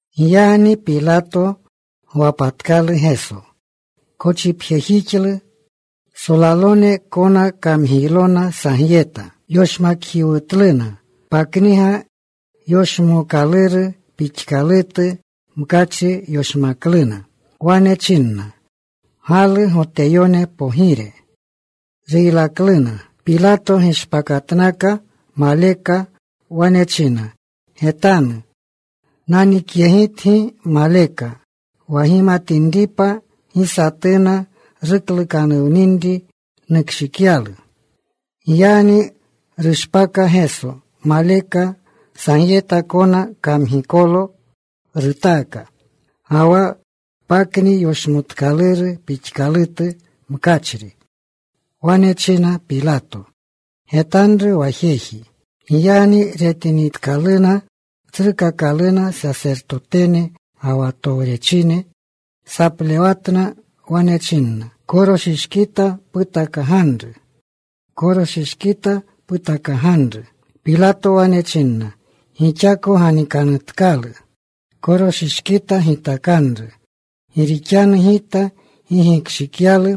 Giyagni Pilato gwapatkalu Geso. Kochipjejixlu. Solalone kona kamgiylona sagyeta. Yoshmakjiwutluna. Pakniga yoshmookaluru pixkalutu mkachri yoshmakluna. Wane chinna, “¡Galu, Goteyone Pogire!” Ruylakluna. Pilato gishpakatnaka maleka. Wane chinna, “Getanu. Nanikyegitgi maleka, wa gimatinripa gi satuna ruklukanuwninri nukshikyalu.” Giyagni rushpaka Geso maleka. Sagyeta kona kamgikolo rutaka, ga wa pakniga yoshmookaluru pixkalutu mkachri. Wane chinna Pilato, “Getanru wa jeji.” Giyagni retinitkaluna tsrukakalune sasertotene ga wa towrechine, saplewatna. Wane chinna, “¡Koroshishkita putakaganru! ¡Koroshishkita putakaganru!” Pilato wane chinna, “Gixako ganikanutkalu. Koroshishkita gitakanru. Gi rixanu gita gi gikshikyalu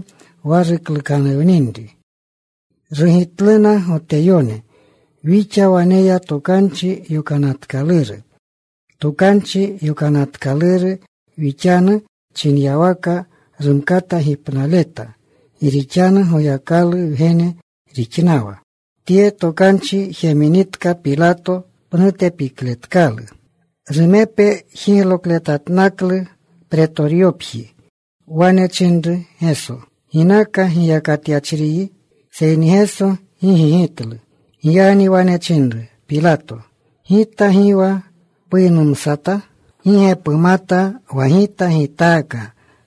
wa ruklukanuwninri.” Rugitluna Goteyone, “Wixa waneya Tokanchi Yokanatkaluru. Tokanchi Yokanatkaluru wixanu chinyawaka rumkata gipnaleta, gi rixanu Goyakalu Wgene rixnawa.” Tye tokanchi jeminitka Pilato, pnute pikletkalu. Rumepe jiglokletatnaklu Pretoryopji. Wane chinru Geso, “¿Ginaka giyakatyachriyi?” Seyni Geso gi gigitlu. Giyagni wane chinru Pilato, “¿Gita gi wa puynumsata? ¿Gi ge pumata wa gita gitaaka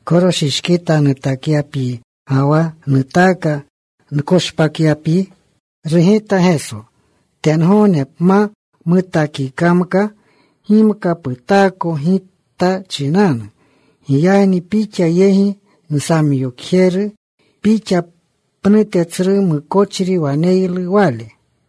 koroshishkita nutakyapyi, ga wa nutaaka nkoshpakyapyi?” Rugita Geso, “Tengogne pma mutaakikamka gimka putaako Gita chinanu. Giyagni pixa yegi nsamyokjeru pixa pnute tsru mukochri waneylu wale.”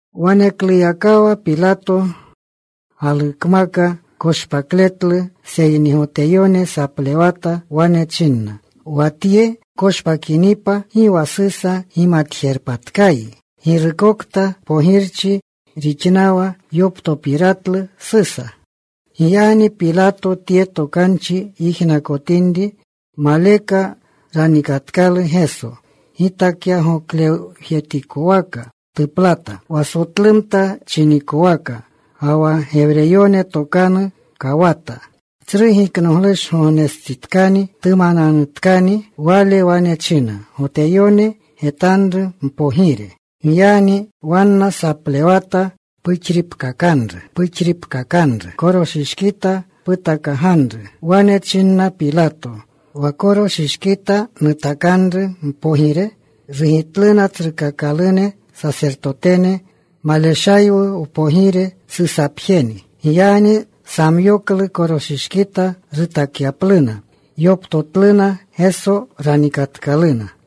Wanekluyakawa Pilato galukmaka koshpakletlu. Seyni Goteyone saplewata. Wane chinna, “Wa Tye pkoshpakinipa, gi wa Susa gimatjerpatkayi. Girukokta pogirchi rixnawa yoptopiratlu Susa.” Giyagni Pilato tye tokanchi yijnakotinri, maleka ranikatkalu Geso. Gitakyagoklewjetikwaka tuplata, wa Sotlumta chinikwaka, ga wa Gewreyone tokanu, Kawata. Tsru Giknoglushgognestsitkani. Tumananutkani. Wale wane chinna Goteyone, “Getanru Mpogire.” Giyagni wanna saplewata, “¡Puxriikakanru! ¡Puxriikakanru! ¡Koroshishkita putakaganru!” Wane chinna Pilato, “¿Wa koroshishkita nutakanru mpogire?” Rugitluna tsrukakalune sasertotene, “Maleshaywu wpogire. Susapjeni.” Giyagni samyoklu koroshishkita rutakyapluna. Yoptotluna Geso. Ranikatkaluna.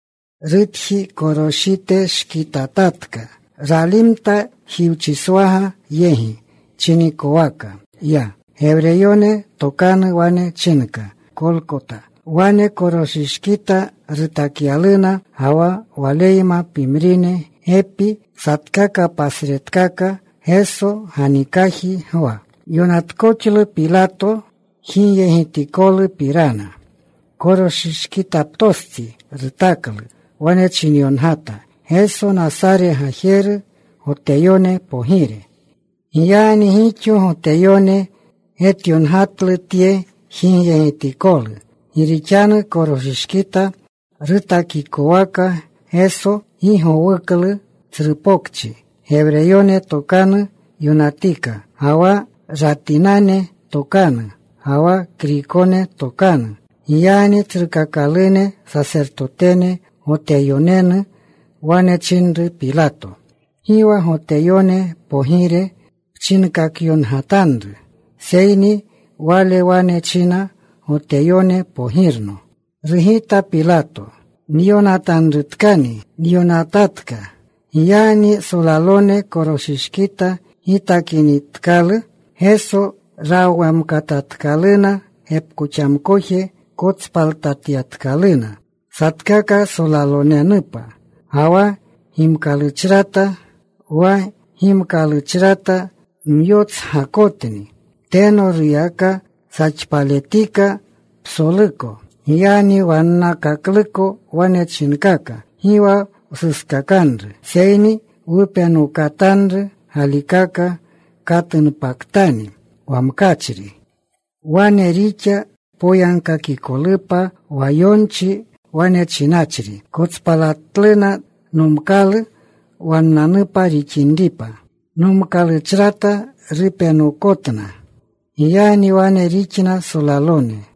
Rutjitakoroshiteshkitatatka. Ralimta. Jiwchiswaga yegi chinikowaka ya. Gewreyone tokanu wane chinka Kolkota. Wane koroshishkita rutakyaluna, ga wa Waleyma pimrine gepi. Satkaka pasretkaka. Geso ganikaji gwa. Yonatkoxlu Pilato jigyegitikolupirana. Koroshishkitaptostsi rutaklu. Wane chinyongata: Geso, Nasare Gajeru, Goteyone Pogire. Giyagni gixo Goteyone getyongatlu tye jigyegitikolu, gi rixanu koroshishkita rutakikwaka Geso, gi gowuklu tsru pokchi. Gewreyone tokanu yonatika, ga wa Ratinane tokanu, ga wa Kriykone tokanu. Giyagni tsrukakalune sasertotene Goteyonenu wane chinru Pilato, “Gi wa ‘Goteyone pogire’ pchinkakyongatanru, seyni, ‘Wale wane china, “Goteyone Pogirno”’” Rugita Pilato, “Nyonatanrutkani nyonatatka.” Giyagni solalone koroshishkita gitakinitkalu Geso, rawamkatatkaluna. Gepkoxamkoje kotspaltatyatkaluna, satkaka solalonenupa. Ga wa gimkaluchrata. Wa gimkaluchrata myotsgakotni. Teno ruyaka saxpaletika psoluko. Giyagni wannakakluko wane chinkaka, “Gi wa wsuskakanru, seyni wupenokatanru galikaka katunpaktani wa mkachri.” Wane rixa poyagkakikolupa wa yonchi wane chinachri: Kotspalatluna nomkalu wannanupa rixinripa. Nomkalu chrata rupenokotna. Giyagni wane rixna solalone.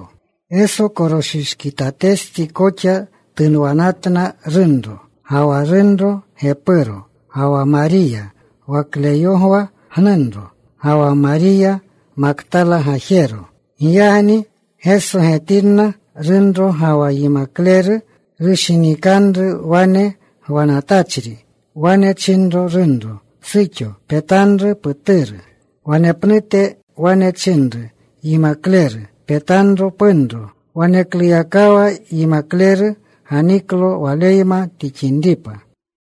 Geso koroshishkitatestsi koxa tunwanatna runro, ga wa runro gepuro, ga wa Mariya wa Kleyogwa gnunro, ga wa Mariya Maktala gajero. Giyagni Geso getinna runro ga wa yimakleru rushinikanru wane gwanatachri, wane chinro runro, “Suxo petanru puturu.” Wanepnute wane chinru yimakleru, “Petanro punro.” Wanekluyakawa yimakleru ganiklo waleyma tixinripa.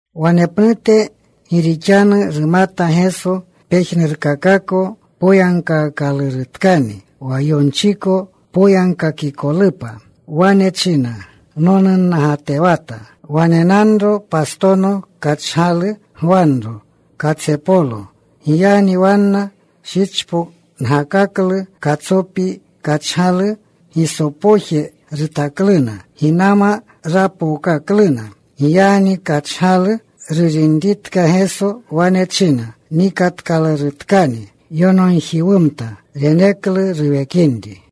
Wanepnute gi rixanu rumata Geso pejnurkakako poyagkaakalurutkani wa yonchiko poyagkakikolupa, wane china, “Nonunnagatewata.” Wanenanro pastono kachgalu gwanro katsepolo. Giyagni wanna shichpongakaklu katsopi kachgalu. Gisopoje rutakluna. Ginama rapookakluna. Giyagni kachgalu rurinitka Geso, wane china, “Nikatkalurutkani.” Yonogjiwumta. Reneklu ruwekinri.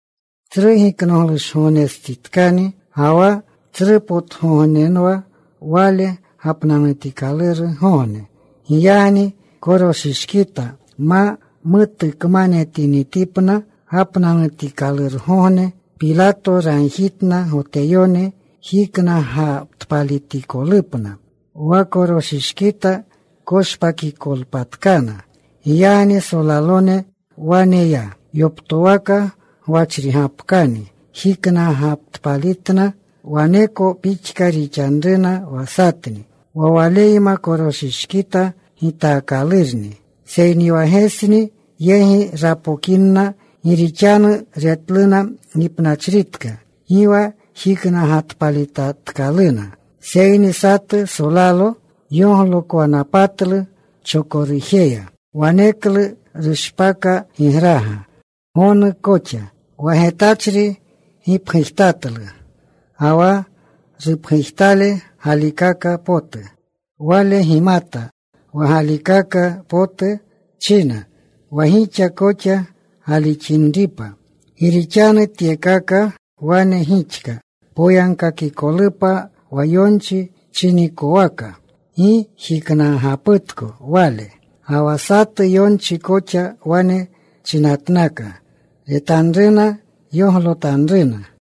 Tsru Giknoglushgognestsitkani, ga wa tsrupotgognenwa wale gapnanutikalurgogne. Giyagni koroshishkita ma mutukmanetinitipna gapnanutikalurgogne, Pilato ragjitna Goteyone jiknagatpalitikolupna, wa koroshishkita koshpakikolpatkana. Giyagni solalone wane ya. Yoptowaka gwachrigapkani jiknagatpalitna. Waneko pixka rixanruna wa satni wa Waleyma koroshishkita gitaakalurni. Seyni wa Gesni yegi rapokinna gi rixanu retluna gipnachritka, gi wa jiknagatpalitatkaluna. Seyni satu solalo yoglokwanapatlu chokorujeya. Waneklu rushpaka gigraga, gonu koxa. Wa getachri gipgujtatlu, ga wa rupgujtale galikaka potu. Wale gimata wa galikaka potu china, wa gixa koxa galixinripa. Gi rixanu tyekaka wane gixka poyagkakikolupa wa yonchi chinikwaka: Gi jiknagaputko Wale. Ga wa satu yonchi koxa wane chinatnaka: Retanruna yoglotanruna.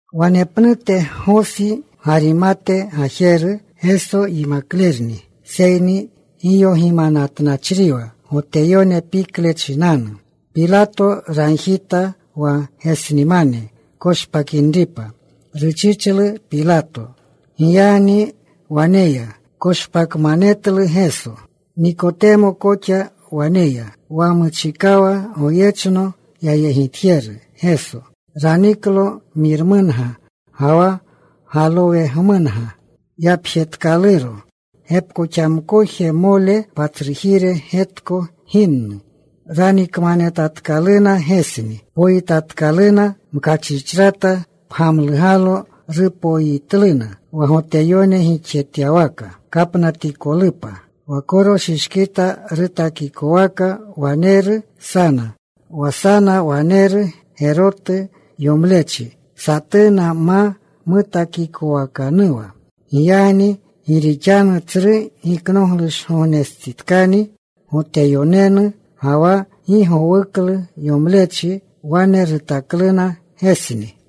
Wanepnute Gosi Garimate gajeru, Geso yimaklerni seyni giyogimatnachriwa Goteyone pikle chinanu. Pilato ragjita wa Gesnimane koshpakinripa. Ruchichlu Pilato. Giyagni wane ya. Koshpakmanetlu Geso. Nikotemo koxa wane ya, wa muchikawa goyechno yayegitjeru Geso. Raniklo miramunga ga wa galowemunga yapjetkaluro, gepkoxamkojmole patsrujire getko ginnu. Ranikmanetatkaluna Gesni. Poyitatkaluna mkachrichrata. Pgamlugalo rupoyitluna wa Goteyone gixjetyawaka kapnatikolupa. Wa koroshishkita rutakikwaka waneru sana. Wa sana waneru gerotu yomlechi, satuna ma mutakikowakanuwa. Giyagni gi rixanu Tsru Giknoglushgognestsitkani Goteyonenu, ga wa gi gowuklu yomlechi, wane rutakluna Gesni.